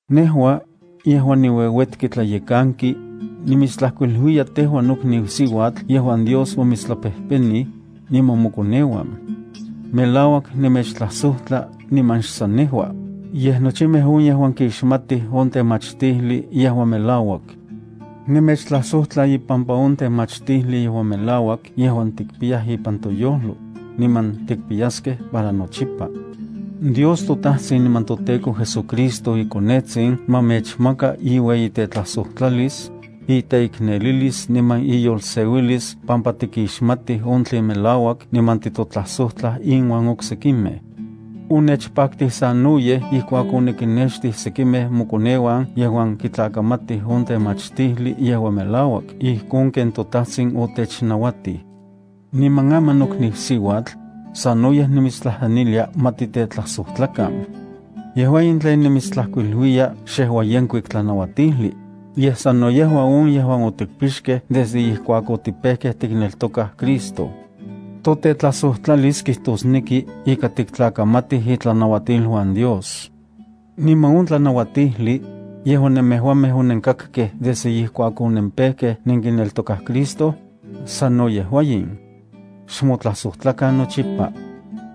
Nejua, yejuan niueuetki tlayekanki, nimitstlajkuiluiya tejua nokniu siuatl yejuan Dios omitstlapejpenij, niman mokoneuan. Melauak nemechtlajsojtla niman xsan nejua, yej nochimej on yejuan kixmatij on temachtijli yejuan melauak. Nemechtlajsojtla ipampa on temachtijli yejuan melauak yejuan tikpiyaj ipan toyojlo, niman tikpiyaskej para nochipa. Dios toTajtsin niman toTEKO JesuCristo iKonetsin ma mechmaka iueyitetlajsojtlalis, iteiknelilis niman iyolseuilis pampa tikixmatij on tlen melauak niman titotlajsojtlaj inuan oksekimej. Onechpaktij sanoyej ijkuak onikinnextij sekimej mokoneuan yejuan kitlakamatij on temachtijli yejuan melauak ijkon ken toTajtsin otechnauatij. Niman aman, nokniu siuatl, sanoyej nimitstlajtlanilia ma titetlajsojtlakan. Yejua in tlen nimitstlajkuiluiya xejua yenkuik tlanauatijli, yej sano yejua on yejuan otikpixkej desde ijkuak otipejkej tikneltokaj Cristo. Totetlajsojtlalis kijtosneki ika tiktlakamatij itlanauatiluan Dios. Niman on tlanauatijli, yejuan nemejuamej onenkakkej desde ijkuak onempejkej nenkineltokaj Cristo, sano yejua in: xmotlajsojtlakan nochipa.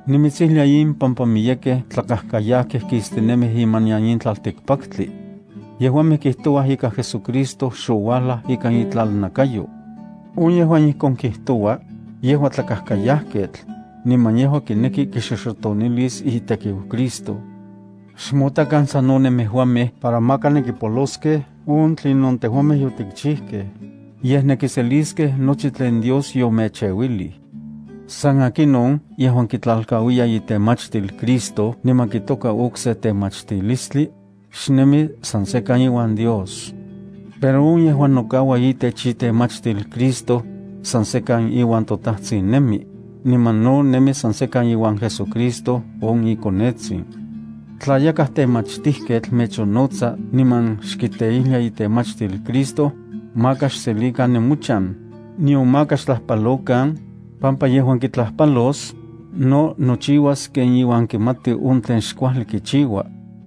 Nimitsijlia in pampa miyekej tlakajkayajkej kistinemij imanian in tlaltikpaktli. Yejuamej kijtouaj ika JesuCristo xouajlaj ikan itlalnakayo. On yejuan ijkon kijtoua, yejua tlakajkayajketl, niman yejua kineki kixoxotonilis itekiu Cristo. Xmotakan sano nemejuamej para maka nenkipoloskej on tlinon tejuamej yotikchijkej, yej nenkiselikej nochi tlen Dios yomecheuilij. San akinon yejuan kitlalkauiya itemachtil Cristo niman kitoka okse temachtilistli, xnemi san sekan iuan Dios. Pero on yejuan nokaua itech itemachtil Cristo, san sekan iuan toTajtsin nemi, niman no nemi san sekan iuan JesuCristo on iKonetsin. Tla yakaj temachtijketl mechonnotsa niman xkiteijlia itemachtil Cristo, maka xselikan nemochan, nion maka xtlajpalokan, pampa yejuan kitlajpalos, no nochiuas ken iuan kimati on tlen xkuajli kichiua.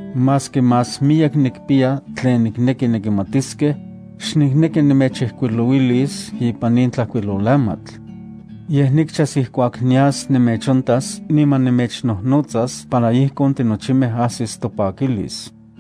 Maski más miyek nikpiya tlen nikneki nenkimatiskej, xnikneki nemechijkuilouilis ipan in tlajkuilolamatl. Yej, nikchas ijkuak nias nemechontas niman nemechnojnotsas para ijkon tinochimej ajsis topakilis.